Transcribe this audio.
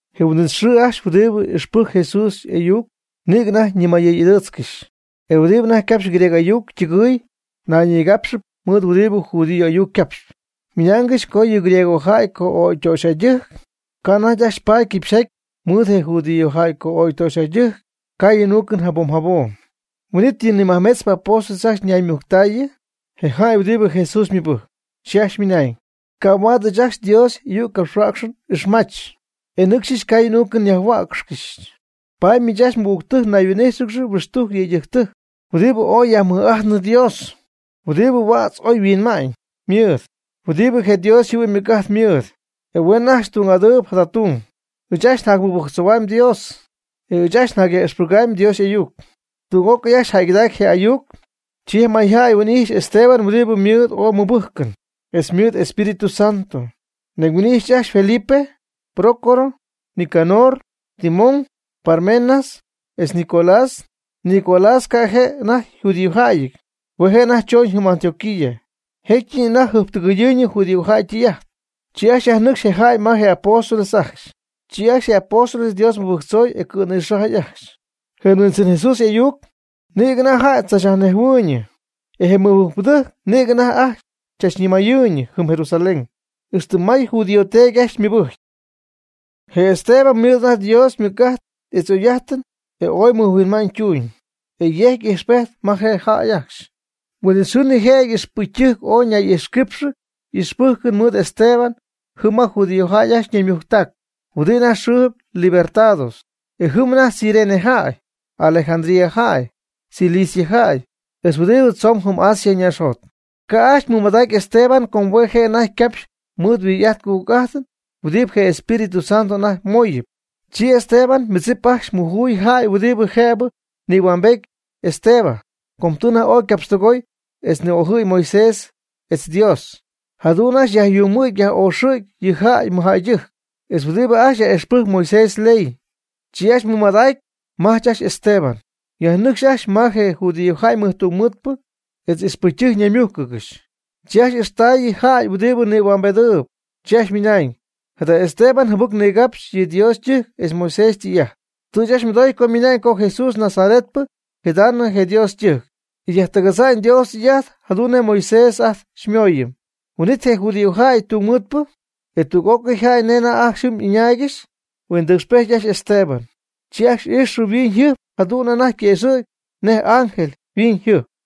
Je huin'it xɨɨ ajcxy huɨdibɨ ixpɨjcp Jesús y'ayuc nïgɨ anajty ñimayɨy'adɨɨtzcɨxy. E huɨdibɨ anajty capxp griego ayuc ytɨgɨɨy nayñigápxɨp mɨɨd huɨdibɨ judío y'ayuc capxp. Ymɨnaangɨxy co yɨ griegojäy co'ögy töxyjädɨjc, ca' anajty ajcxy paady quipxyjaty mɨɨd je judíojäy co'ögy töxyjäydɨjc caayɨn uucɨn jabom jabom. Huin'it yɨ majmetzpɨ apóstoles ajcxy yajnaymujctaayɨ je jäy huɨdibɨ Jesús mɨbɨjcp, chi ajcxy ymɨnañ: ―Ca' huaad ɨɨch ajcxy Dios y'ayuccapxhuäcxɨn n'ijxmajch, e nɨcxyɨch caayɨn uucɨn yajhuäcxcɨxy. Paady miich ajcxy mɨgügtɨjc nayhuin'íjxɨgɨx huɨxtujc yëydɨjctɨjc huɨdibɨ oy yajmɨj'ajtnɨ Dios, huɨdibɨ huädz oy yhuinma'ñ ymɨɨd, huɨdibɨ je Dios yjɨhuɨ'ñ ymɨc'ajt mɨɨd, e huen ajcxy tung'adɨɨb jada tung. Ɨɨch ajcxy njacmɨbɨjctzohuamy Dios, etz ɨɨch ajcxy njacyaj'ixpɨgamy Dios y'ayuc. Tüg'ócɨy ajcxy jäygɨdacy je' ayuc. Chi je mayjäy huin'ijxy Esteban huɨdibɨ ymɨɨd ooy ymɨbɨ́jcɨn, etz ymɨɨd Espírito Santo. Nañ huin'ijxy ajcxy Felipe, Prócoro, Nicanor, Timón, Parmenas, etz Nicolás. Nicolás ca' je' anajty yjudíojäyɨty. Hue' je' anajty chooñ jɨm Antioquía, jécyɨp anajty jɨjptɨgɨyɨɨyñɨ judíojäy ytɨy'ajt. Chi ajcxy yajnɨcxy je jäy ma je apóstoles ajcxy. Chi ajcxy je apóstoles Dios mɨbɨjctzoy e cɨ̈nïxajy ajcxy. Je Huindzɨn Jesús y'ayuc nïgɨ anajty jäy tzachnejhuɨɨyñɨ. E je mɨbɨjcpɨdɨjc nïgɨ anajty ajcxy chachnimayɨɨyñɨ jɨm Jerusalén, ixtɨ may judío teedy ajcxy ymɨbɨjcy. Je Esteban ymɨɨd anajty Dios ymɨc'ajt etz y'oy'ajt e oy mɨjhuinma'ñ tuuñ, etz yejcy ijxpejt ma jäy ajcxy. Huin'it xɨɨ nijëjɨty ixpɨcytɨjc ooy ñay'ijxquípxɨgɨxy y'ixpɨjcɨn mɨɨd Esteban jɨm ma judíojäy ajcxy ñaymujctac huɨdi anajty yxɨɨ Libertados. E jɨm anajty Cirene jäy, Alejandría jäy, Cilicia jäy, etz huɨdibɨ tzomb jɨm Asia ñaaxjot. Ca' ajcxy mɨmadacy Esteban com hue' je' anajty ycapxy mɨɨd yhuijy'ajt ycujc'ajt huɨdibɨ je Espíritu Santo anajty mooyɨp. Chi Esteban ymɨdzip ajcxy mujuy jäy huɨdibɨ jëbɨ nïhuambety Esteban, co tɨ anajty ooy ycapxtɨgooy etz ni'ojɨ̈y Moisés etz Dios. Jadu'n ajcxy yajyuumɨ̈gy yaj'oxɨ̈gy yɨ jäy mɨjjäydɨjc, etz huɨdibɨ ajcxy yaj'ixpɨjcp Moisés yley. Chi ajcxy mɨmadacy majch ajcxy Esteban, yajnɨcxy ajcxy ma je judíojäy ymɨjtungmɨɨdpɨ etz ixpɨcytɨjc ñaymújcɨgɨxy. Chi ajcxy ixtaayɨ jäy huɨdibɨ nïhuambedɨɨb, chi ajcxy ymɨnañ: ―Jada Esteban jɨbɨc nigapxy yɨ Dios ytɨjc etz Moisés ytɨy'ajt. Tɨ ɨɨch ajcxy mɨdoy co ymɨna'ñ co Jesús je Nazaretpɨ yjidamy je Dios ytɨjc, e yajtɨgadza'ñ Dios ytɨy'ajt jadu'n nej Moisés ajt xymooyɨm. Huin'it je judíojäy tungmɨɨdpɨ e tüg'ócɨy jäy nej anajty ajcxy jɨm ɨñaaygɨxy huindɨcxpejty ajcxy Esteban. E chi ajcxy ijxɨ yhuiñyjɨjp jadu'n anajty quëxɨ̈gy nej y'ángel yhuiñyjɨjp.